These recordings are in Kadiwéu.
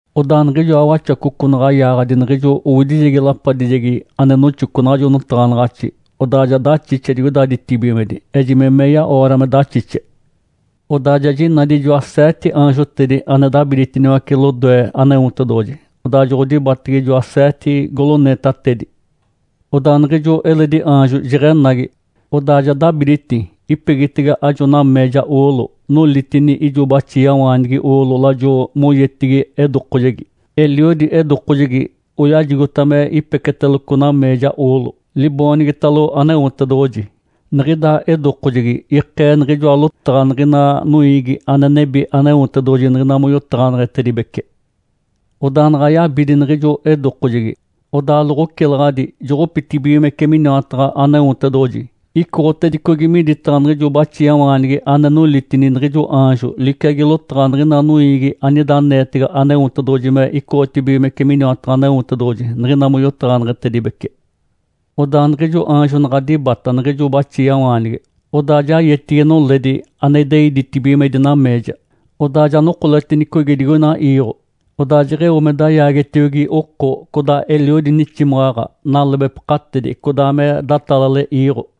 Odaa niɡ̶ijoa Waxacoco naɡ̶a yaaɡ̶adi niɡ̶ijo owidijegi lapadijegi ane noxoco naɡ̶ajo notaɡ̶anaɡ̶axi, odaa ja daxixe digoida ditibigimedi, ejime meya-oora me daxixe. Odaa ja jinadi ijoa seete aanjotedi ane dabiditiniwace lodoe Aneotedoɡ̶oji. Odaa joɡ̶odibatege ijoa seete goloneetatedi. Odaa niɡ̶ijo eledi aanjo jeɡ̶enagi, odaa ja dabiditi ipegitege ajo nameeja oolo nolitini ijo baxiawaanigi oolo lajo moyetigi edokojegi. Eliodi edokojegi oyajigota me ipeketeloco nameeja oolo, liboonigitalo Aneotedoɡ̶oji. Niɡ̶ida edokojegi ikee niɡ̶ijoa lotaɡ̶a niɡ̶ina noiigi ane nebi Aneotedoɡ̶oji niɡ̶ina moyotaɡ̶aneɡ̶etedibece. Odaa naɡ̶a yabidi niɡ̶ijo edokojegi, odaa loɡ̶ocilaɡ̶adi joɡ̶opitedibigimece miniwataɡ̶a Aneotedoɡ̶oji icoɡ̶otedicogi midataɡ̶a niɡ̶ijo baxiawaanigi ane nolitini niɡ̶ijo aanjo, liciagi lotaɡ̶a niɡ̶ina noiigi anida aneetege Aneotedoɡ̶oji me icotibigimece miniwataɡ̶a Aneotedoɡ̶oji niɡ̶ina moyotaɡ̶aneɡ̶etedibece. Odaa niɡ̶ijo aanjo naɡ̶a dibata niɡ̶ijo baxiawaanigi, odaa ja yetigi noledi ane idei ditibigimedi nameeja. Odaa ja nokoletinicogi digoina iiɡ̶o. Odaa jeɡ̶eo me dayaagetiogi oko, codaa eliodi niximaɡ̶aɡ̶a, nalebepakatedi, codaa me datalale iiɡ̶o.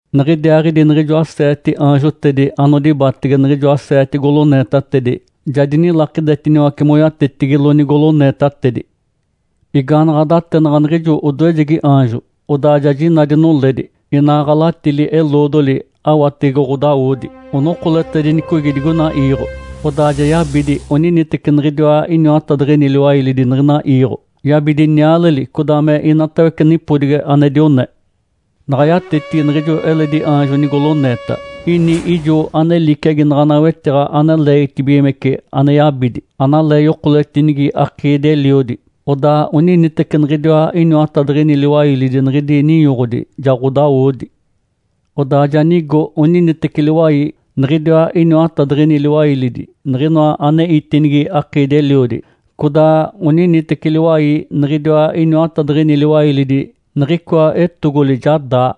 Niɡ̶idiaaɡ̶idi niɡ̶ijoa seete aanjotedi anodibatege niɡ̶ijoa seete goloneetatedi ja dinilakidetiniwace moyatetigilo nigoloneetatedi. Igaanaɡ̶a datenaɡ̶a niɡ̶ijo odoejegi aanjo, odaa ja jinadi noledi, inaa ɡ̶alatili-eloodoli awatege ɡ̶odawodi, onokoletedinicogi digoina iiɡ̶o. Odaa ja yabidi oniniteci niɡ̶idiwa iniwatadiɡ̶ini liwailidi niɡ̶ina iiɡ̶o, yabidi nialeli, codaa me inatawece nipodigi ane dione. Naɡ̶a yatetigi niɡ̶ijo eledi aanjo nigoloneeta, ini ijo ane liciagi naɡ̶ana wetiɡ̶a ane leegitibigimece ane yabidi, analee oyokoletinigi akiidi-eliodi, odaa oniniteci niɡ̶idiwa iniwatadiɡ̶ini liwailidi niɡ̶idi ninyoɡ̶odi ja ɡ̶odawodi. Odaa ja nigo oniniteci liwai, niɡ̶idiwa iniwatadiɡ̶ini liwailidi niɡ̶inoa ane itinigi akiidi-eliodi, codaa oniniteci liwai niɡ̶idiwa iniwatadiɡ̶ini liwailidi niɡ̶icoa etogoli ja daa.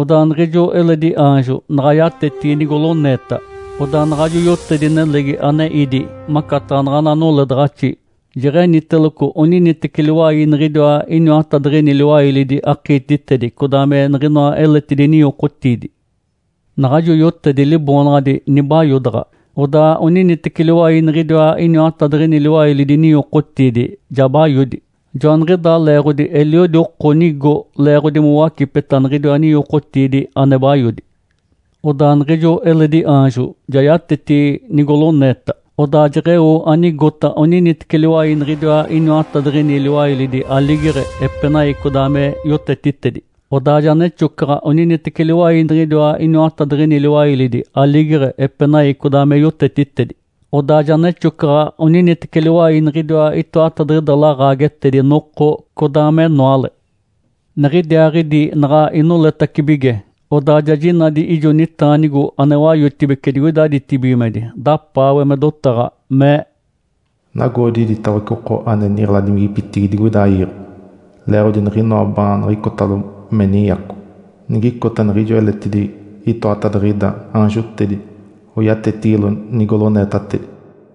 Odaa niɡ̶ijo eledi aanjo naɡ̶a yatetigi nigoloneeta, odaa naɡ̶ajo yotedi nelegi ane ídi macataɡ̶a naɡ̶ana noledaɡ̶axi jeɡ̶eniteloco oniniteci liwai niɡ̶idiwa iniwatadiɡ̶ini liwailidi akiititedi codaa me niɡ̶inoa eletidi ninyokotiidi. Naɡ̶ajo yotedi liboonaɡ̶adi “Nibayodaɡ̶a”. Odaa oniniteci liwai niɡ̶idiwa iniwatadiɡ̶ini liwailidi ninyokotiidi ja bayodi. Joaniɡ̶idaa leeɡ̶odi eliodi oko nigo leeɡ̶odi mowacipeta niɡ̶idiwa ninyokotiidi ane bayodi. Odaa niɡ̶ijo eledi aanjo ja yatetigi nigoloneeta. Odaa jeɡ̶eo anigota oniniteci liwai niɡ̶idiwa iniwatadiɡ̶ini liwailidi aligeɡ̶e, epenai, codaa me yotetitedi. Odaa ja nexocaɡ̶a oniniteci liwai niɡ̶iniwa iniwatadiɡ̶ini liwailidi aligeɡ̶e, epenai, codaa me yotetitedi, Odaa ja nexocaɡ̶a oniniteci liwai niɡ̶idiwa itoatadiɡ̶ida laɡ̶aagetedi noko codaa menoale. Niɡ̶idiaaɡ̶idi naɡ̶a inoletacibige, odaa ja jinadi ijo nitaanigo ane wayotibece digoida ditibigimedi, dapaawe me dotaɡ̶a, mee, “Nagoodi iditawece oko ane niɡ̶eladimigipitigi digoida iiɡ̶o leeɡ̶odi niɡ̶inoa baaniɡ̶icotalo me ninyaco, nigicota niɡ̶ijoa eletidi itoatadiɡ̶ida aanjotedi nigaaɡ̶a oyatetigilo nigoloneetatedi.”